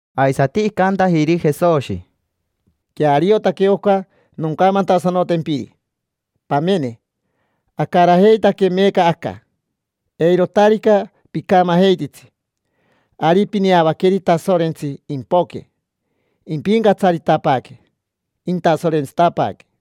Aisati icantajiri Jesoshi: —Queariotaque oca noncamantasanotempiri. Pamene, acarajeitaque meeca aca. Eirotarica picamajeititsi, ari pineavaqueri Tasorentsi impoque, impincatsaritapaaque, intasorentsitapaaque.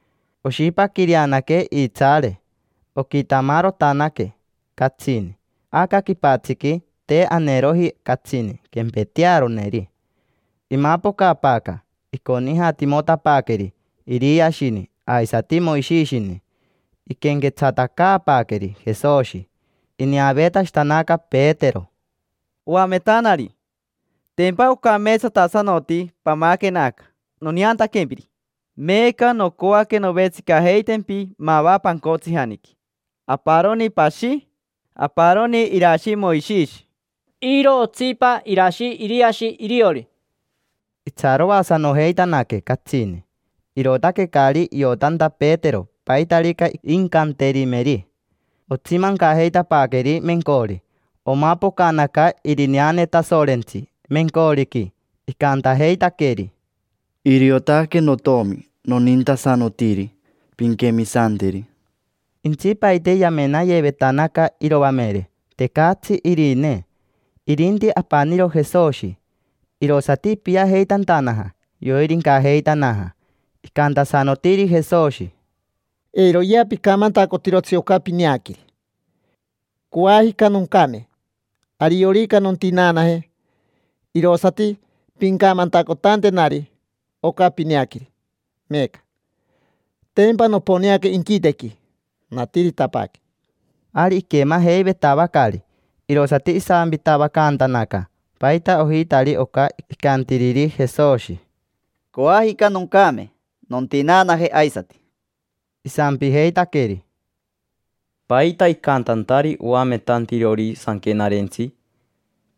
Oshipaquireanaque iitsaare. Oquitamarotanaque catsini. Aca quipatsiqui te aneeroji catsini quempetearoneri. Imapocapaaca, iconijatimotapaaqueri Iriashini aisati Moishishini, iquenquetsatacaapaaqueri Jesoshi. Ineaveetashitanaca Petero: —Oametanari, tempa ocameetsatasanoti pamaquena aca, noneantaquempiri. Meeca nocoaque novetsicajeitempi mava pancotsijaniqui: aparoni pashi, aparoni irashi Moishishi, iro otsipa irashi Iriashi iriori. Itsaroasanojeitanaque catsini, irootaque caari iotanta Petero paitarica incanterimeri. Otsimancajeitapaaqueri mencori. Omapocanaca irineane Tasorentsi mencoriqui, icantajeitaqueri: —Iriotaque notomi nonintasanotiri, pinquemisanteri. Intsipaite yamenayevetanaca iroamere, tecatsi irinee, irinti apaniro Jesoshi. Irosati ipiajeitantanaja, yoirincajeitanaja. Icantasanotiri Jesoshi: —Eiroyea picamantacotirotsi oca pineaqueri. Coajica noncame. Ariorica nontinaanaje, irosati pincamantacotantenari oca pineaqueri meeca. Tempa noponeaca inquitequi, natiritapaaque. Ari iquemajeivetavacari, irosati isampitavacantanaca paita ojitari oca icantiriri Jesoshi: “Coajica noncame. Nontinaanaje aisati”. Isampijeitaqueri: —¿Paita icantantari oametantirori sanquenarentsi: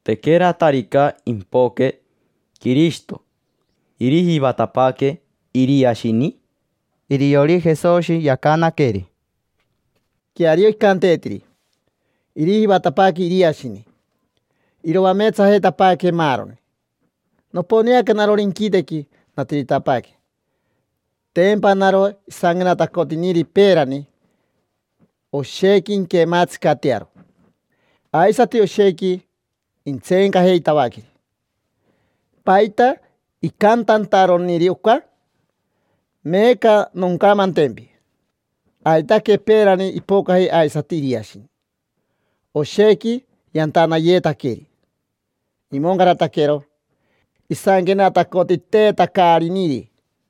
“Tequeratarica impoque Quirishito, irijivatapaaque Iriashini”? Iriori Jesoshi yacanaqueri: —Queario icanteetiri: “Irijivatapaaque Iriashini, iroameetsajeitapaaque maaroni”. Noponeaca narori inquitequi, natiritapaaque, tempa naro isanquenatacotiniri peerani: “Oshequi inquemaatsicatearo, aisati oshequi intseencajeitavaqueri”. ¿Paita icantantaroniri oca? Meeca noncamantempi: aitaque peerani ipocaji aisati Iriashini. Oshequi yantanayetaqueri, imoncarataquero isanquenatacotiteetacariniri.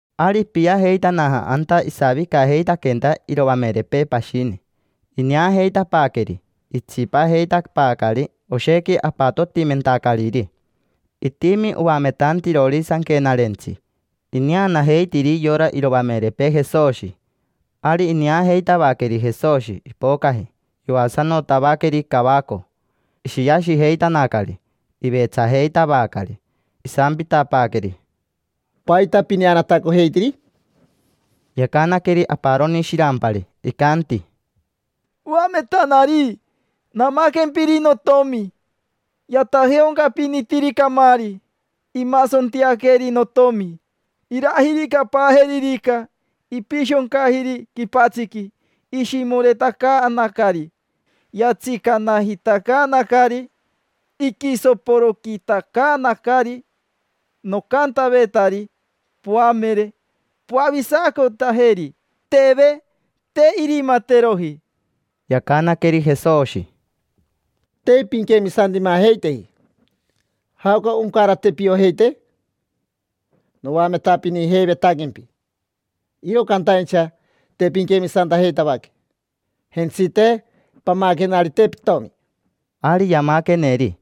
Ari ipiajeitanaja anta isavicajeitaquenta iroamerepee pashini. Ineajeitapaaqueri itsipajeitapaacari oshequi apatotimentacariri. Itimi oametantirori sanquenarentsi, ineanajeitiri yora iroamerepee Jesoshi. Ari ineajeitavaqueri Jesoshi, ipocaji, yoasanotavaqueri cavaco. Ishiashijeitanacari, ivetsajeitavacari. Isampitapaaqueri: —¿Paita pineanatacojeitiri? Yacanaqueri aparoni shirampari, icanti: —Oametanari, namaquempiri notomi. Yatajeaoncapinitiri camaari. Imasontiaqueri notomi. Irajiricapaajeririca, ipishoncajiri quipatsiqui, ishimoretacaanacari, yatsicanajitacaanacari, iquisoporoquitacaanacari. Nocantavetari poamere: “Poavisacotajeri”. Teve, te irimateroji. Yacanaqueri Jesoshi: —Te pinquemisantimajeiteji. ¿Jaoca oncarate piojeite? Noametapinijeivetaquempi, iro cantaincha te pinquemisantajeitavaque. Jentsite, pamaquenarite pitomi. Ari yamaqueneri.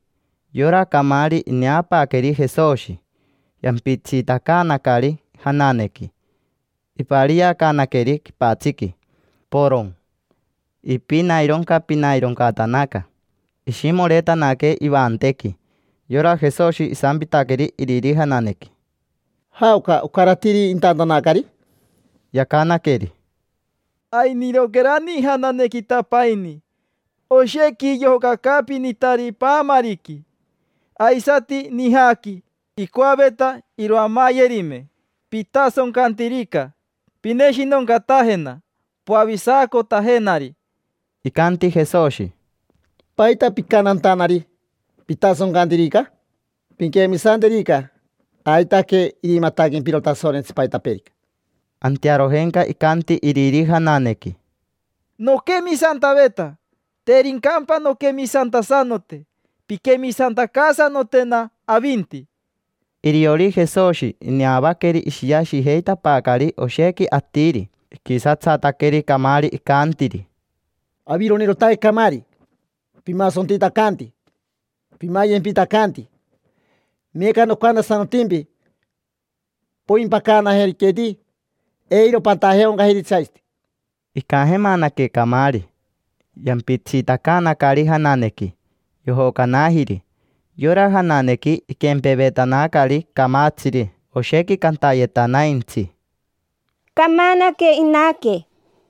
Yora camaari, ineapaaqueri Jesoshi. Yampitsitacaanacari jananequi, ipariacaanaqueri quipatsiqui, poron. Ipinaironcapinaironcatanaca, ishimoretanaque ivantequi. Yora Jesoshi isampitaqueri iriri jananequi: —¿Jaoca ocaratiri intantanacari? Yacanaqueri: —Ainiroquerani ijananequitapaini. Oshequi yojocacaapinitari paamariqui, aisati nijaqui. Icoaveta iroamayerime. Pitasoncantirica, pineshinoncatajena, poavisacotajenari. Icanti Jesoshi: —¿Paita picantantanari: “Pitasoncantirica”? Pinquemisanterica, aitaque irimataquempiro Tasorentsi paitapeerica. Antearojenca icanti iriri jananequi: —Noquemisantaveta. Tericampa nonquemisantasanote, pinquemisantacaasanotena avinti. Iriori Jesoshi ineavaqueri ishiashijeitapaacari oshequi atiri. Iquisatsataqueri camaari, icantiri: —Avironirotaque camaari. Pimasontitacanti, pimayempitacanti. Meeca nocantasanotimpi, poimpacanajeriqueti, eiro patajeaoncajiritsi aisati. Icajemanaque camaari, yampitsitacaanacari jananequi, yojocanajiri. Yora jananequi iquempevetanacari camatsiri. Oshequi cantayetanaintsi: —Camanaque inaque.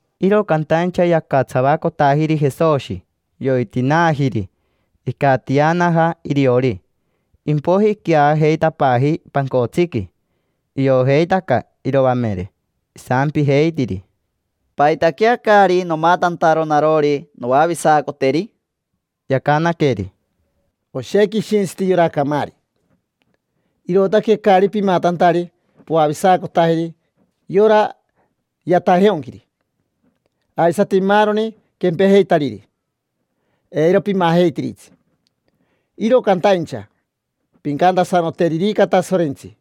Iro cantaincha yacatsavacotajiri Jesoshi, yoitinaajiri, icatianaja iriori. Impoiji iqueajeitapaaji pancotsiqui. Iojeitaca iroamere, isampijeitiri: —¿Paitaquea caari nomatantaro narori noavisacoteri? Yacanaqueri: —Oshequi ishintsiti yora camaari, irootaque caari pimatantari poavisacotajeri yora yatajeaonquiri. Aisati maaroni quempejeitariri, eiro pimajeitiritsi. Iro cantaincha, pincantasanoteririca Tasorentsi,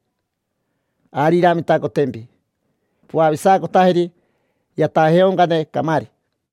ari iramitacotempi poavisacotajeri yatajeaoncane camaari.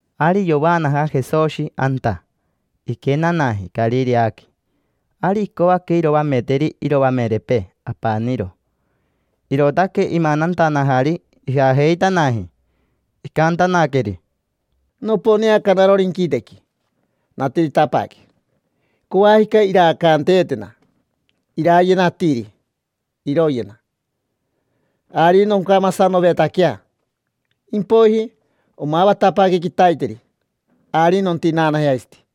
Ari yovaanaja Jesoshi anta, iquenanaji Carireaqui. Ari icoaque iroameteri iroamerepee apaniro, irootaque imanantanajari ijajeitanaji. Icantanaqueri: —Noponeaca narori inquitequi, natiritapaaque: coajica iraacaanteetena. Irayena atiri, iroyena. Ari noncamasanovetaquea, impoiji, omavatapaaque quitaiteri, ari nontinaanaje aisati.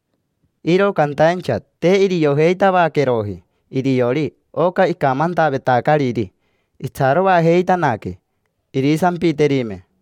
Iro cantaincha te iriojeitavaqueroji iriori oca icamantavetacariri. Itsaroajeitanaque irisampiterime.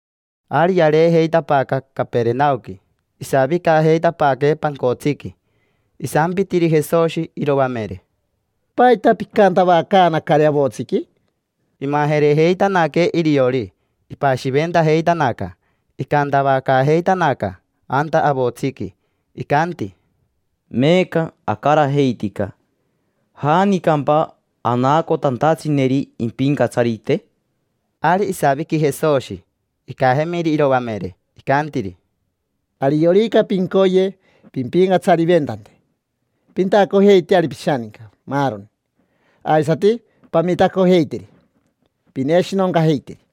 Ari yareejeitapaaca Caperenaoqui, isavicajeitapaaque pancotsiqui. Isampitiri Jesoshi iroamere: —¿Paita picantavacaanacari avotsiqui? Imajerejeitanaque iriori, ipashiventajeitanaca. Icantavacaajeitanaca anta avotsiqui, icanti: —Meeca acarajeitica, ¿janicampa anacotantatsineri impincatsarite? Ari isaviqui Jesoshi. Icajemiri iroamere, icantiri: —Ariorica pincoye pimpincatsariventante, pintacojeiteari pishaninca maaroni, aisati pamitacojeiteri, pineshinoncajeiteri.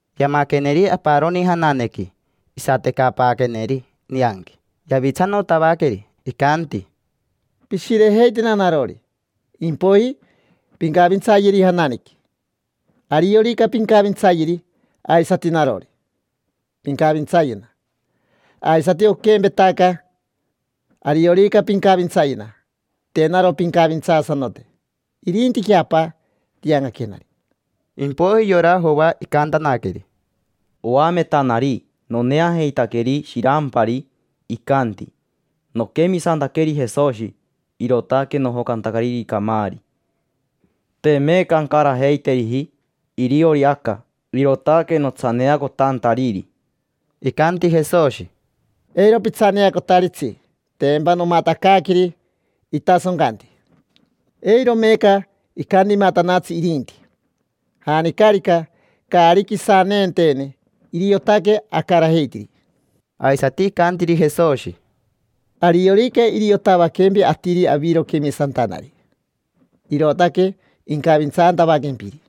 Yamaqueneri aparoni jananequi. Isatecapaaqueneri nianqui, yavitsanotavaqueri. Icanti: —Pishirejeitena narori, impoiji pincavintsayeri jananequi. Ariorica pincavintsayeri, aisati narori, pincavintsayena. Aisati oquempetaca, ariorica pincavintsayena, te naro pincavintsaasanote, irintiquea Apa tiancaquenari. Impoiji yora Joa icantanaqueri: —Oametanari, noneajeitaqueri shirampari, icanti: “Noquemisantaqueri Jesoshi, irootaque nojocantacariri camaari”. Te meeca ancarajeiteriji iriori aca, irootaque notsaneacotantariri. Icanti Jesoshi: —Eiro pitsaneacotaritsi. Tempa nomatacaaqueri itasoncanti, eiro meeca icantimatanatsi irinti. Janicarica caari quisanenteene iriotaque acarajeitiri. Aisati icantiri Jesoshi: —Ariorica iriotavaquempi atiri aviro quemisantanari, irootaque incavintsantavaquempiri,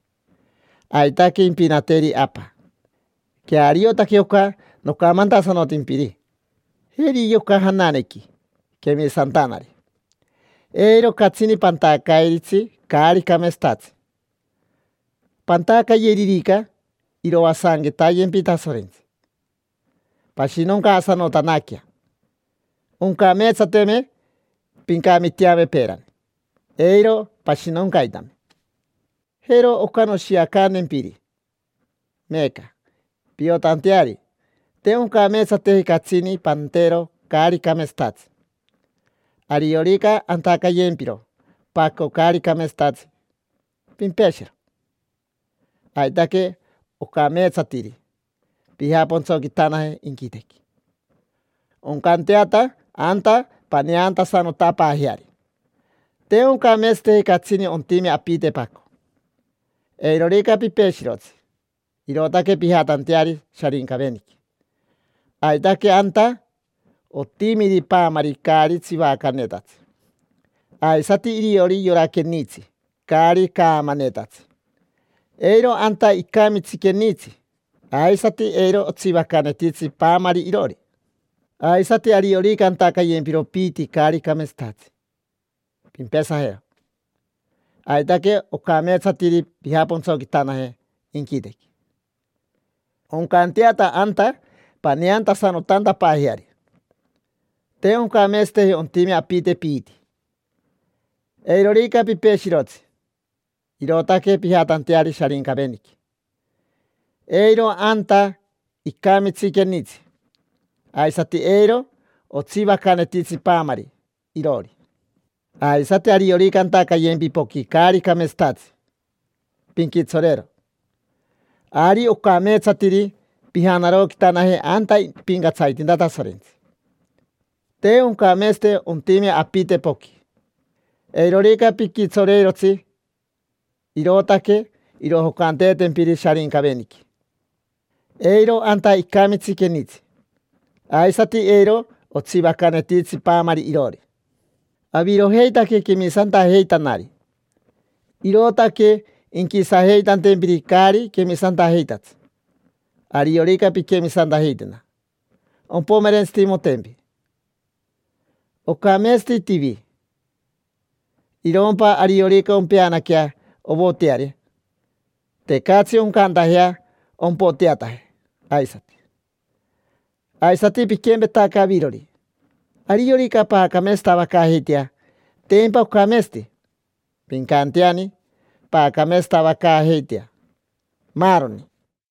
aitaque impinateri Apa. Queariotaque oca nocamantasanotimpiri. Jeri yoca jananequi, quemisantanari: eiro catsini pantacairitsi caari cameetsatatsi. Pantacayeririca, iroasanquetayempi Tasorentsi, pashinoncaasanotanaquea. Oncameetsateme pincamiteame peerani, eiro pashinoncaitame. Jero oca noshiacantempiri meeca piotanteari te oncameetsateji catsini pantero caari cameetsatatsi. Ariorica antacayempiro paco caari cameetsatatsi, pimpeshero. Aitaque ocameetsatiri pijapontsoquitanaje inquitequi, oncanteata anta paneantasanotapaajeari. Te oncameetsateji catsini ontime apite paco: eirorica pipeshirotsi, irootaque pijatanteari Sharincaveniqui. Aitaque anta otimiri paamari caari tsivacanetatsi, aisati iriori yora quenitsi caari caamanetatsi. Eiro anta icamitsi quenitsi, aisati eiro otsivacanetitsi paamari iroori. Aisati ariorica antacayempiro piiti caari cameetsatatsi, pimpesajero. Aitaque ocameatsatiri pijapontsoquitanaje inquitequi, oncanteata anta paneantasanotantapaajeari. Te oncameetsateji ontime apite piiti: eirorica pipeshirotsi, irootaque pijatanteari Sharincaveniqui. Eiro anta icamitsi quenitsi. Aisati eiro otsivacanetitsi paamari iroori. Aisati ariorica antacayempi poqui caari cameetsatatsi, pinquitsoreero. Ari ocameetsatiri pijanaroquitanaje anta ipincatsaritinta Tasorentsi. Te oncameetsate ontime apite poqui: eirorica piquitsoreirotsi, irootaque irojocanteetempiri Sharincaveniqui. Eiro anta icamitsi quenitsi. Aisati eiro otsivacanetitsi paamari iroori. Avirojeitaque quemisantajeitanari, irootaque inquisajeitantempiri caari quemisantajeitatsi. Ariorica pinquemisantajeitena, ompomerentsitimotempi. Ocameetsati tivi. Irompa ariorica ompeanaquea ovoteare, tecatsi oncantajea ompoteataje aisati. Aisati piquempetaca avirori: ariorica paacameetsatavacaajeitea, tempa ocameetsati: pincanteani paacameetsatavacaajeitea, maaroni.